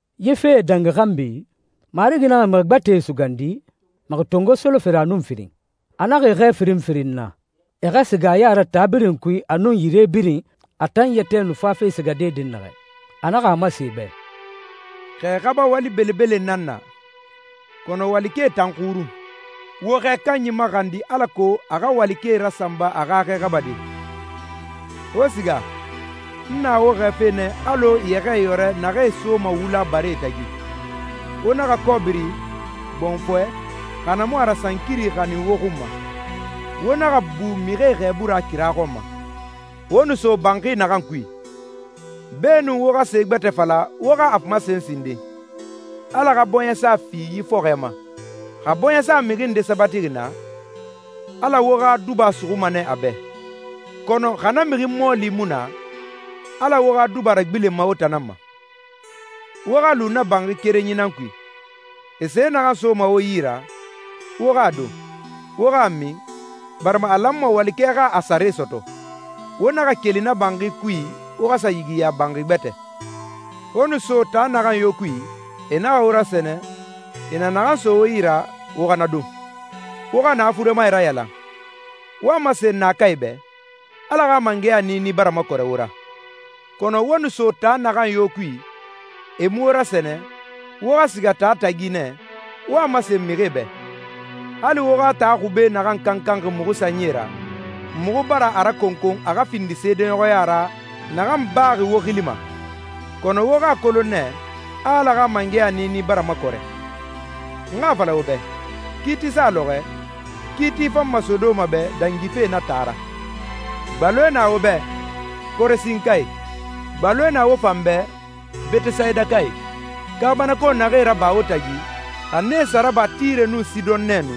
Yi fee dangi xanbi, Marigi naxa mixi gbɛtɛe sugandi, mixi tongo solofere a nun firin. A naxa e xɛɛ firin firin na, e xa siga a ya ra taa birin kui a nun yire birin a tan yɛtɛ nu fafe sigade dɛnnaxɛ. A naxa a masen e bɛ, «Xɛ xaba wali belebele nan na, kɔnɔ walikɛe tan xurun. Wo xɛ kanyi maxandi alako a xa walikɛe rasanba a xa xɛ xabade. Wo siga. N na wo xɛɛfe nɛ alɔ yɛxɛɛyɔrɛ naxee soma wula baree tagi. Wo naxa kɔbiri, gbɔnfɔɛ, xa na mu a ra sankiri xanin wo xun ma. Wo naxa bu mixie xɛɛbu ra kira xɔn ma.» «Wo nu so banxi naxan kui, beenun wo xa se gbɛtɛ fala wo xa a masen sinden, ‹Ala xa bɔɲɛsa fi yi fɔxɔɛ ma.› Xa bɔɲɛsa mixi nde sabatixi naa, Ala wo xa duba suxuma nɛ a bɛ, kɔnɔ xa na mixi mɔɔli mu na, Ala wo xa duba ragbilenma wo tan nan ma. Wo xa lu na banxi kerenyi nan kui. E se naxan soma wo yi ra, wo xa a don, wo xa a min, barima a lanma walikɛ xa a sare sɔtɔ. Wo naxa keli na banxi kui wo xa sa yigiya banxi gbɛtɛ.» «Wo nu so taa naxan yo kui e naxa wo rasɛnɛ, e na naxan so wo yi ra, wo xa na don. Wo xa na furemae rayalan, wo a masen naakae bɛ, ‹Ala xa mangɛya niini bara makɔrɛ wo ra.› Kɔnɔ wo nu so taa naxan yo kui e mu wo rasɛnɛ, wo xa siga taa tagi nɛ, wo a masen mixie bɛ, ‹Hali wo xa taa xube naxan kankanxi muxu sanyie ra, muxu bara a rakɔnkɔn a xa findi seedeɲɔxɔya ra naxan baxi wo xili ma. Kɔnɔ wo xa a kolon nɛ, a Ala xa mangɛya niini bara makɔrɛ.› N xa a fala wo bɛ, kiiti sa lɔxɔɛ, kiiti fanma Sodoma bɛ dangife na taa ra.» «Gbaloe na wo bɛ, Korasinkae! Gbaloe na wo fan bɛ, Betesayidakae! Kaabanako naxee raba wo tagi, xa nee sa raba Tire nun Sidɔn nɛ nu,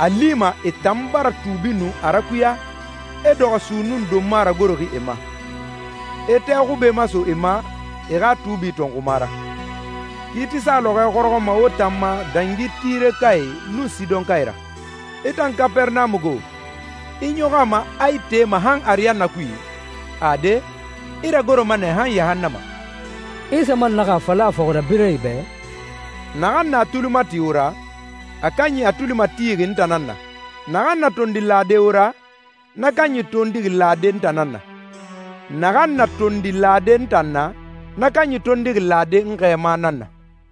a a lima e tan bara tuubi nu a rakuya, e dɔxɔ sunnun donma ragoroxi e ma, e tɛ xube maso e ma e xa tuubi tɔnxuma ra. Kiiti sa lɔxɔɛ xɔrɔxɔma wo tan ma dangi Tirekae nun Sidɔnkae ra. I tan Kapɛrɛnamu go, i ɲɔxɔ a ma a i tema han ariyanna kui? Ade, i ragoroma nɛ han yahannama.» Isa man naxa a fala a fɔxirabirɛe bɛ, «Naxan na a tuli mati wo ra, a kanyi a tuli matixi n tan nan na. Naxan na tondi lade wo ra, na kanyi tondixi lade n tan nan na. Naxan na tondi lade n tan na, na kanyi tondixi lade n xɛɛma nan na.»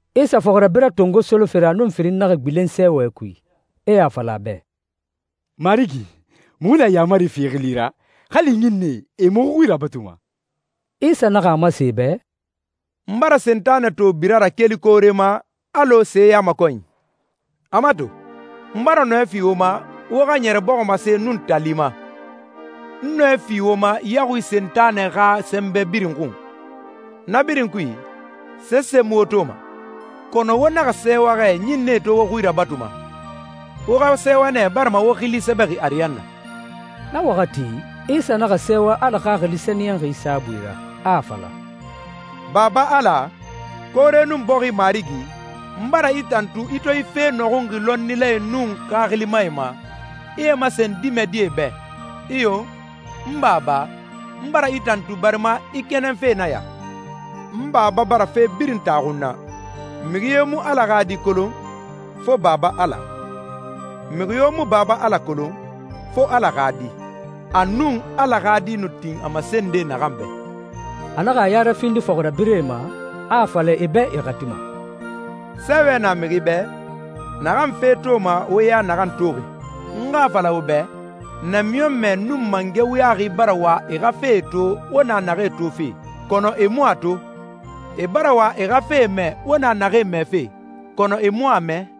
Isa fɔxirabirɛ tongo solofere a nun firin naxa gbilen sɛɛwɛ kui, e a fala a bɛ, «Marigi, muxu na yaamari fi i xili ra, hali ɲinnɛe, e muxu xui rabatuma.» Isa naxa a masen e bɛ, «N bara Sentanɛ to bira ra keli koore ma alɔ seyamakɔnyi. A mato, n bara nɔɛ fi wo ma wo xa ɲɛrɛ bɔximase nun tali ma, n nɔɛ fi wo ma yaxui Sentanɛ xa sɛnbɛ birin xun. Na birin kui, sese mu wo toma. Kɔnɔ wo naxa sɛɛwa xɛ ɲinnɛe to wo xui rabatuma. Wo xa sɛɛwa nɛ barima wo xili sɛbɛxi ariyanna.» Na waxati, Isa naxa sɛɛwa Ala Xaxili Sɛniyɛnxi saabui ra, a a fala, «Baba Ala, koore nun bɔxi Marigi, n bara i tantu i to yi fee nɔxunxi lɔnnilae nun xaxilimae ma, i e masen dimɛdie bɛ. Iyo, n Baba, n bara i tantu barima i kɛnɛn fe nan ya.» «N Baba bara fe birin taxu n na. Mixi yo mu Ala xa Di kolon, fo Baba Ala. Mixi yo mu Baba Ala kolon, fo Ala xa Di, a nun Ala xa Di nu tin a masende naxan bɛ.» A naxa a ya rafindi fɔxirabirɛe ma, a a fala e bɛ e xati ma, «Sɛɛwɛ na mixi bɛ, naxan fee toma wo ya naxan toxi! N xa a fala wo bɛ, namiɲɔnmɛ nun mangɛ wuyaxi bara wa e xa fee to wo na naxee tofe, kɔnɔ e mu a to. E bara wa e xa fee mɛ wo na naxee mɛfe, kɔnɔ e mu a mɛ.»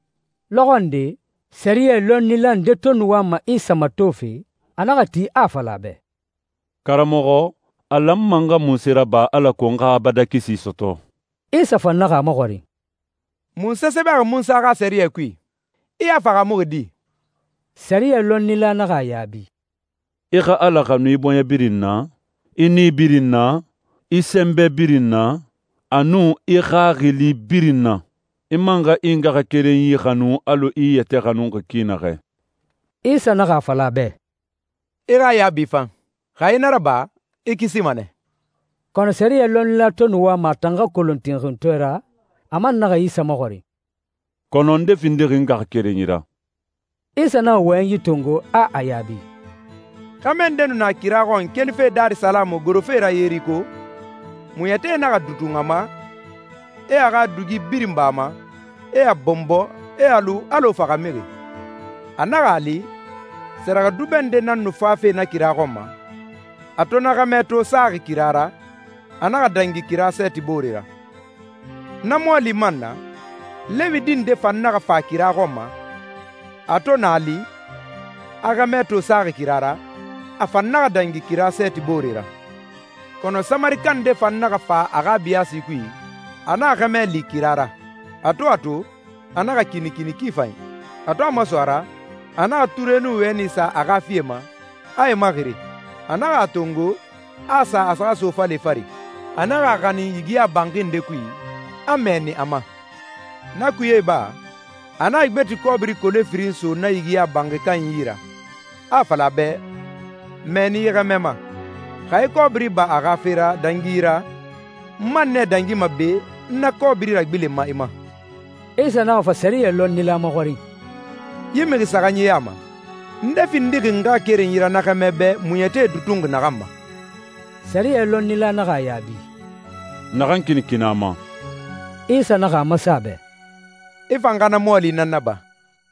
Lɔxɔ nde, sɛriyɛ lɔnnila nde to nu wama Isa matofe, a naxa ti, a a fala a bɛ, «Karamɔxɔ, a lanma n xa munse raba alako n xa abadan kisi sɔtɔ?» Isa fan naxa a maxɔrin, «Munse sɛbɛxi Munsa xa sɛriyɛ kui? I a fahaamuxi di?» Sɛriyɛ lɔnnila naxa a yaabi, «I xa Ala xanu i bɔɲɛ birin na, i nii birin na, i sɛnbɛ birin na, a nun i xaxili birin na. I man xa i ngaxakerenyi xanu alɔ i i yɛtɛ xanuxi ki naxɛ.» Isa naxa a fala a bɛ, «I xa yaabi fan. Xa i na raba, i kisima nɛ.» Kɔnɔ sɛriyɛ lɔnnila to nu wama a tan xa kolon tinxintɔɛ ra, a man naxa Isa maxɔrin, «Kɔnɔ nde findixi n ngaxakerenyi ra?» Isa naxa wɔyɛnyi tongo, a a yaabi, «Xɛmɛ nde nu na kira xɔn kelife Darisalamu gorofe ra Yeriko. Muɲɛtie naxa dutun a ma, e a xa dugie birin ba a ma, e a bɔnbɔ, e a lu alɔ faxamixi. A naxa a li, sɛrɛxɛdubɛ nde nan nu fafe na kira xɔn ma. A to na xɛmɛ to saxi kira ra, a naxa dangi kira sɛɛti boore ra. Na mɔɔli man na, Lewi di nde fan naxa fa kira xɔn ma. A to na li, a xɛmɛ to saxi kira ra, a fan naxa dangi kira sɛɛti boore ra.» «Kɔnɔ Samarika nde fan naxa fa a xa biyaasi kui, a na xɛmɛ li kira ra. A to a to, a naxa kinikini ki fanyi. A to a maso a ra, a naxa ture nun wɛni sa a xa fie ma, a e maxiri. A naxa a tongo, a a sa a xa sofale fari. A naxa a xanin yigiya banxi nde kui, a mɛɛni a ma. Na kuye iba, a naxa gbeti kɔbiri kole firin so na yigiya banxi kanyi yi ra, a a fala a bɛ, ‹Mɛɛni yi xɛmɛ ma. Xa i kɔbiri ba a xa fe ra dangi yi ra, n man nɛ dangima be n na kɔbiri ragbilenma i ma.›» Isa naxa fa sɛriyɛ lɔnnila maxɔrin, «Yi mixi saxanyi ya ma, nde findixi ngaxakerenyi ra na xɛmɛ bɛ muɲɛtie dutun naxan ma?» Sɛriyɛ lɔnnila naxa a yaabi, «Naxan kinikini a ma.» Isa naxa a masen a bɛ, «I fan xa na mɔɔli nan naba.»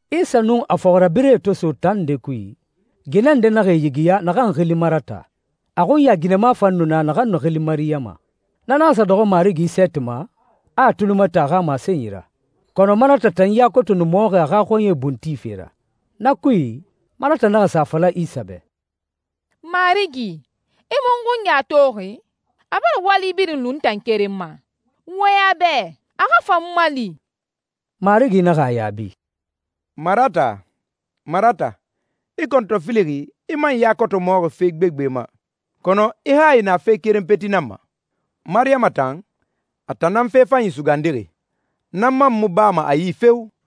Isa nun a fɔxirabirɛe to so taa nde kui, ginɛ nde naxa e yigiya naxan xili Marata. A xunya ginɛma fan nu na naxan nu xili Mariyama. Na naxa sa dɔxɔ Marigi sɛɛti ma, a a tuli mati a xa masenyi ra, kɔnɔ Marata tan ya koto nu mɔxi a xa xɔɲɛe bun tife ra. Na kui, Marata naxa sa a fala Isa bɛ, «Marigi, i mu n xunya toxi? A bara wali birin lu n tan keren ma. Wɔyɛn a bɛ, a xa fa n mali.» Marigi naxa a yaabi, «Marata, Marata, i kɔntɔfilixi, i man ya koto mɔxi fe gbegbe ma, kɔnɔ i hayi na fe keren peti nan ma. Mariyama tan, a tan nan fe fanyi sugandixi. Na man mu bama a yi feo!»